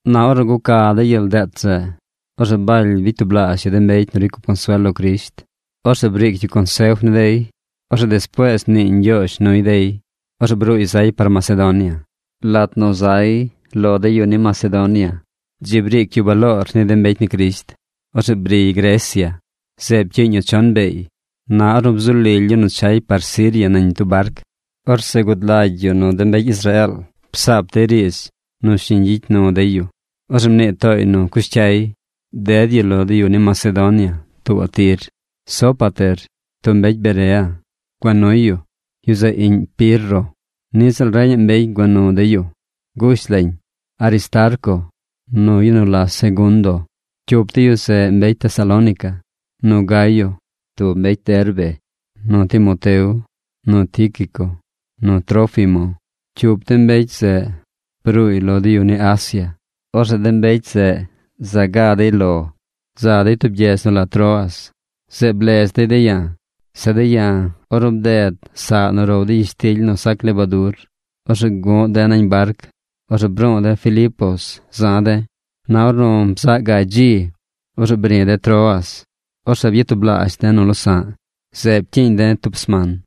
Na ornu guca de gyel deet zeꞌ, orzeꞌ Baly bicy tublaazh yu de mbecy nu ricy cup consuel lo Crisht. Orzeꞌ briic yu consef ni dey. Orzeꞌ despuees mniiy ñgyoozh nuy dey. Orzeꞌ bruuy zay par Macedonia. Lat nu zay de lo yu ni Macedonia, dzi briic yu baloor ni de mbecy ni Crisht. Orzeꞌ briy Grecia. Zeꞌ pcyiiñ yu chon beey. Na ornu bzu lily yu nu chay par Siria nañ tub barc, orzeꞌ gud lagy yu nu de mbecy Israeel psaap dey riidz nu shiñ gyicy nu dey yu. Orzeꞌ mnii tooy nu cush cyay, ded yu lo de yu ni Macedonia tuubaꞌ tir. Sópater, tub mbecy Berea, gua nuy yu. Yu zeꞌ iꞌñ Pirro. Niꞌ ziꞌl reñaꞌ mbecy gua nu dey yu. Gush lañ: Aristarco, nu yu nu la Segundo, cyup de yu zeꞌ mbecy Tesalónica, nu Gayo, tub yu Derbe, nu Timoteo, nu Tíquico nu Trófimo, cyup de mbecy zeꞌ bruuy lo de yu ni Asia. Orzeꞌ de mbecy zeꞌ za ga la dey par lo de̱. Za dey tub gyedz nu la Troas. Zeꞌ blez dey de̱ ya̱. Zeꞌ de̱ ya̱, ornu bded saꞌ nu row dey gyishtily nu sac lebadur, orzeꞌ guꞌ de̱ nañ barc. Orzeꞌ bruu de̱ Filipos za̱ de̱. Na ornu bzaꞌ gaay dzi, orzeꞌ bri̱ de̱ Troas. Orzeꞌ byatublaazh de̱ nu losa̱ꞌ. Zeꞌ pcyiiñ de̱ tub sman.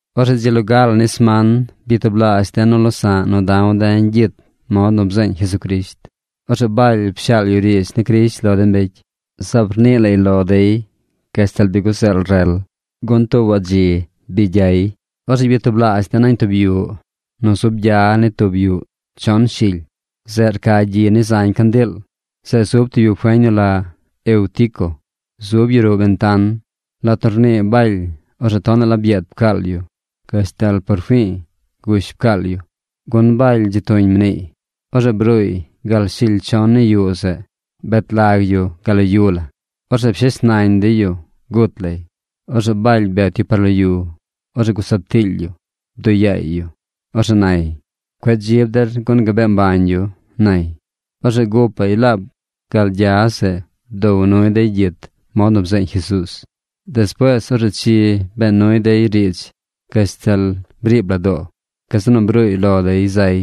Orzeꞌ dzi loga la ni sman byatublaazh de̱ nu losa̱ꞌ nu da̱w de̱ gyit mod nu bzeeñ Jesucrisht. Orzeꞌ Baly pshaal yu riidz ni Crisht lo de mbecy. Zaab rnii lay lo dey gashtal or guzeel rel, gun tuubaꞌ dzi gyay. Orzeꞌ byatublaazh de̱ nañ tub yuꞌ nu zub gya ni tub yuꞌ chon shily. Zeꞌ rca gyi ni zañ candiil. Zeꞌ zub tub yu feñ nu la Eutico. Zub yu ruꞌ bentan. Lat nu rnii Baly, orzeꞌ tonaꞌ la byeed pcaal yu gashtal por fi̱i̱ gush la pcaal yu, gun Baly dzi tuñ mniiy. Orzeꞌ bruuy gal shily chon ni yuꞌ zeꞌ. Bet lag yu gal lo yu la. Orzeꞌ pshes nañ dey yu gut lay. Orzeꞌ Baly bet yu par lo yu. Orzeꞌ gusaab tiily yu. Bduꞌ yaay yu. Orzeꞌ nay: ―Cueꞌ dzib der gun gabee mbañ yu ―nay. Orzeꞌ gupaꞌy laab gal gya zeꞌ bdow nuy dey gyit mod nu bzeeñ Jesuuz. Despuees orzeꞌ chi bee nuy dey riidz gashtal briib la doo. Gazeꞌ nu bruuy lo dey zay.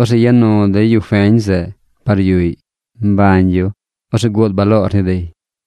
Orzeꞌ ya nu dey yu feñ zeꞌ par yuꞌy mbañ yu. Orzeꞌ guud baloor ni dey.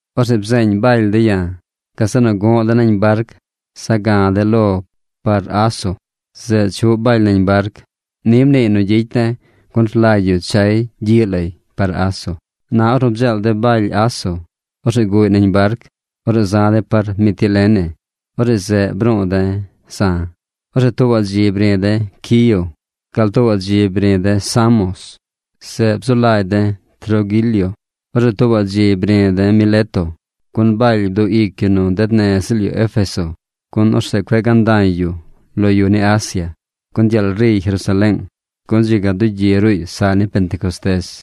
Orzeꞌ bzeeñ Baly de̱ ya̱. Gazeꞌ nu gu̱ꞌ de̱ nañ barc za̱ ga̱ de̱ lo par Aso. Zeꞌ chuꞌ Baly nañ barc. Ni mniiy nu gyicy de̱, gun rlagy yu chay gyiꞌ lay par Aso. Na ornu bdzeel de̱ Baly Aso, orzeꞌ guꞌy nañ barc. Orzeꞌ za̱ de̱ par Mitilene. Orzeꞌ zeꞌ bru̱u̱ de̱ za̱. Orzeꞌ tuubaꞌ dzi bri̱ de̱ Quío. Gal tuubaꞌ dzi bri̱ de̱ Samos. Zeꞌ bzu lagy de̱ Troguilio. Orzeꞌ tuubaꞌ dzi bri̱ de̱ Mileto. Gun Baly bduꞌ ic yu nu ded nez ziꞌl yu Éfeso, gun orzeꞌ cueꞌ ganda̱y yu lo yu ni Asia, gun gyeel riy Jerusaleeng, gun dzi ga dugyi ruꞌy saꞌ ni Pentecostés.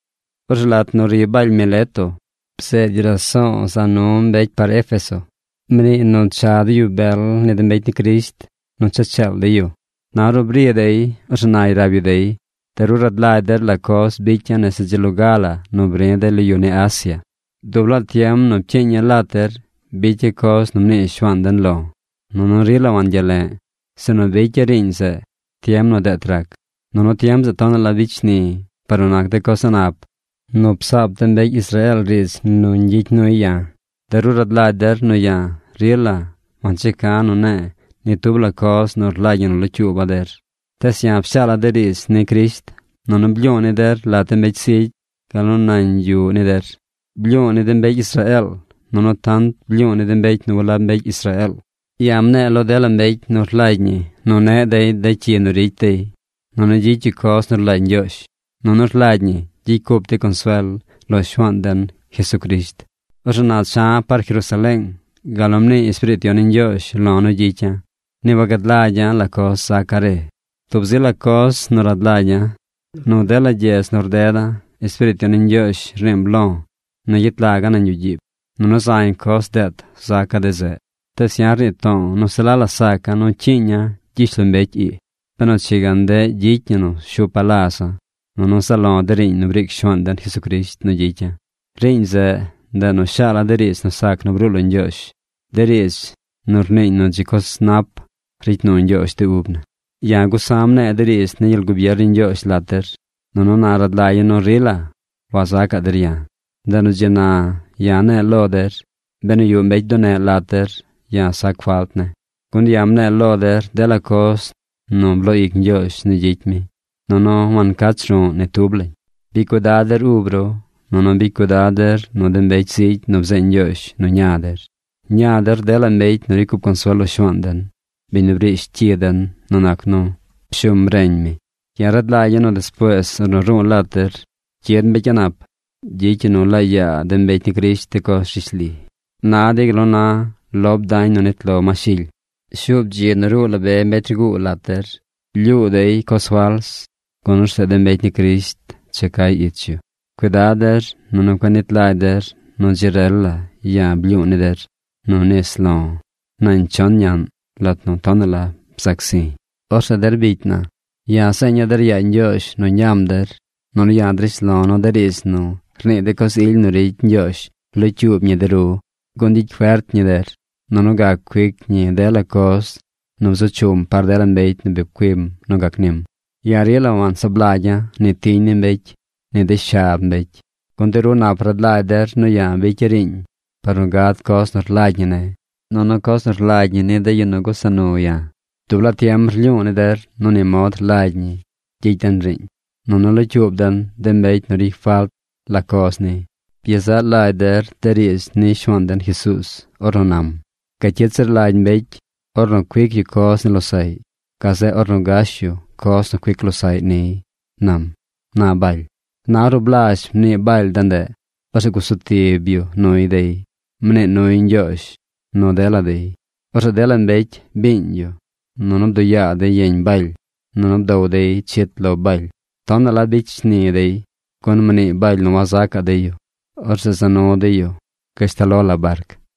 Orzeꞌ lat nu ri Baly Mileto, bzeed yu raso̱o̱ za nu mbecy par Éfeso. Mniiy nu cha de yu bel ni de mbecy ni Crisht nu cha cheel dey yu. Na ornu bri dey, orzeꞌ nay rab yu dey: ―De ru rad lagy der la coz bicya̱ nese dzi loga la nu bri̱ de lo yu ni Asia. Dub laa tiem nu pcyiiña̱ lat der bicya̱ coz nu mnii Shuaan den lo̱. Nunu rila wangyale̱ꞌ, sinu bicya̱ riiñ zeꞌ tiem nu deet rac. Nunu tiem zeꞌ tonaꞌ la bicy shni̱ par nu nac de coz a̱ꞌ nap nu psaap de mbecy Israeel riidz nu ñgyicy nuy ya̱. De ru rad lagy der nu ya̱ rila wancheca̱ nu ne̱e̱ ni tub la coz nu rlagy ñi nu locyuuba̱ der. Tees ya̱ pshaala̱ de riidz ni Crisht, nunu blyu̱u̱ ni der lat de mbecy zigy gal nu nañ yuꞌ ni der. Blyu̱u̱ ni de mbecy Israeel, nunu tant blyu̱u̱ ni de mbecy nu walab mbecy Israeel. Ya̱ mne̱e̱ lo dela mbecy nu rlagy ñi neꞌ dey de cyi nu ricy dey, nunu gyicy yu coz nu rlagy Ñgyoozh. Nunu rlagy ñi gyicy cup dey consuel lo Shuaan den, Jesucrisht. Orzeꞌ na cha̱ par Jerusaleeng gal nu mnii Espiriit Yon ni Ñgyoozh lo̱ nu gyicya̱. Ni wagad lagy ya̱ la coz zaca̱ re. Tub zi la coz rad lagy ya̱. Nu dela gyedz nu rdeda̱ Espiriit Yon ni Ñgyoozh rniim lo̱ nu gyet laga̱ nañ yuꞌ gyiib, nunu zañ coz deet zaca̱ de zeꞌ. Tees ya̱ rnii to̱o̱ nu se la la saca̱ nu cyiiña̱ gyishlombecy ii, benu chi ga ndeꞌ gyicy ñi nu shupa̱ laza̱, nunu zaꞌ lo̱ de riiñ nu briic Shuaan den Jesucrisht nu gyicya̱. Riiñ zeꞌ ndeꞌ nu shaala̱ de riidz nu sac nu bruu lo Ñgyoozh, de riidz nu rniiñ nu dzi coz nap ricy nu Ñgyoozh de ub na. ’Ya̱ gusa̱ mne̱e̱ de riidz ni gyel gubier ni Ñgyoozh lat der, nunu na rad lagya̱ nu rila wazacaꞌ der ya̱. Ndeꞌ nu dzi na ya̱ ne̱e̱ lo der, benu yuꞌ mbecy bduneꞌ lat der, ya̱ sac falt ne̱. Gun ya̱ mne̱e̱ lo der dela coz nu bloo ic Ñgyoozh nu gyicy mi, nunu wancach ru̱ꞌ ni tub lañ. Bicy cuidad der ub ru, nunu bicy cuidad der nu de mbecy zigy nu bzeeñ Ñgyoozh nu ña der. Ña der dela mbecy nu ricy cup consuel lo Shuaan den, biñ nu brish cyi den nu nac nu pshum reñ mi. Ya̱ rad lagya̱ nu despuees ornu ru̱u̱ lat der, cyid mbecy a̱ꞌ nap. Gyicy yu nu laa yaa de mbecy ni Crisht de coz rishli. Na dey gal na lob dañ nu nit lo ma shily. Shuub dzi nu ruu la be mbecy rguu lat der. Lyuu dey coz fals, gun orzeꞌ de mbecy ni Crisht cha cay ich yu. Cuidad der, nunu cueꞌ nit lagy der nu dzi rel la ya̱ blyu̱u̱ ni der nu nis lo̱ nañ chon ñaꞌn lat nu tonaꞌ la bzac zi̱. ’Orzeꞌ der bicy na, ya̱ zeeña̱ der yaa Ñgyoozh nu ñam der. Nunu ya̱ drish lo̱ nu de riidz nu rnii de coz ily nu ricy Ñgyoozh locyuub ñi de ru, gun gyicy fert ñi der, nunu gac cuic ñi dela coz nu bzu chum par dela mbecy nu bi pcuim nu gac nim. Ya̱ rila wansaab lagya̱ ni tiñ ni mbecy, ni de shab mbecy. Gun de ru nap rad lagy der nu ya̱ bicya̱ riiñ par nu gad coz nu rlagy ñi ne̱, nunu coz nu rlagy ñi ni de yu nu gusa nu ya̱. Dub laa tiem rlyu̱u̱ ni der nu ni mod rlagy ñi gyicy den riiñ, nunu locyuub den de mbecy nu ricy falt la coz ni. Byezaꞌ lagy der de riidz ni Shuaan den Jesuuz ornu nam: “Gacyit zir lagy mbecy ornu cuic yu coz ni losaꞌy gazeꞌ ornu gash yu coz nu cuic losaꞌy niy”, nam ―na Baly. Na ornu blazh mnii Baly de ndeꞌ, orzeꞌ gusu tib yu nuy dey. Mnii nuy Ñgyoozh nu dela dey. Orzeꞌ dela mbecy biiñ yu, nunu bduꞌ yaa dey yeñ Baly. Nunu bdow dey chit lo Baly. Tonaꞌ la bicy shni dey, gun mnii Baly nu wazacaꞌ dey yu. Orzeꞌ za nu dey yu gashtal lo la barc.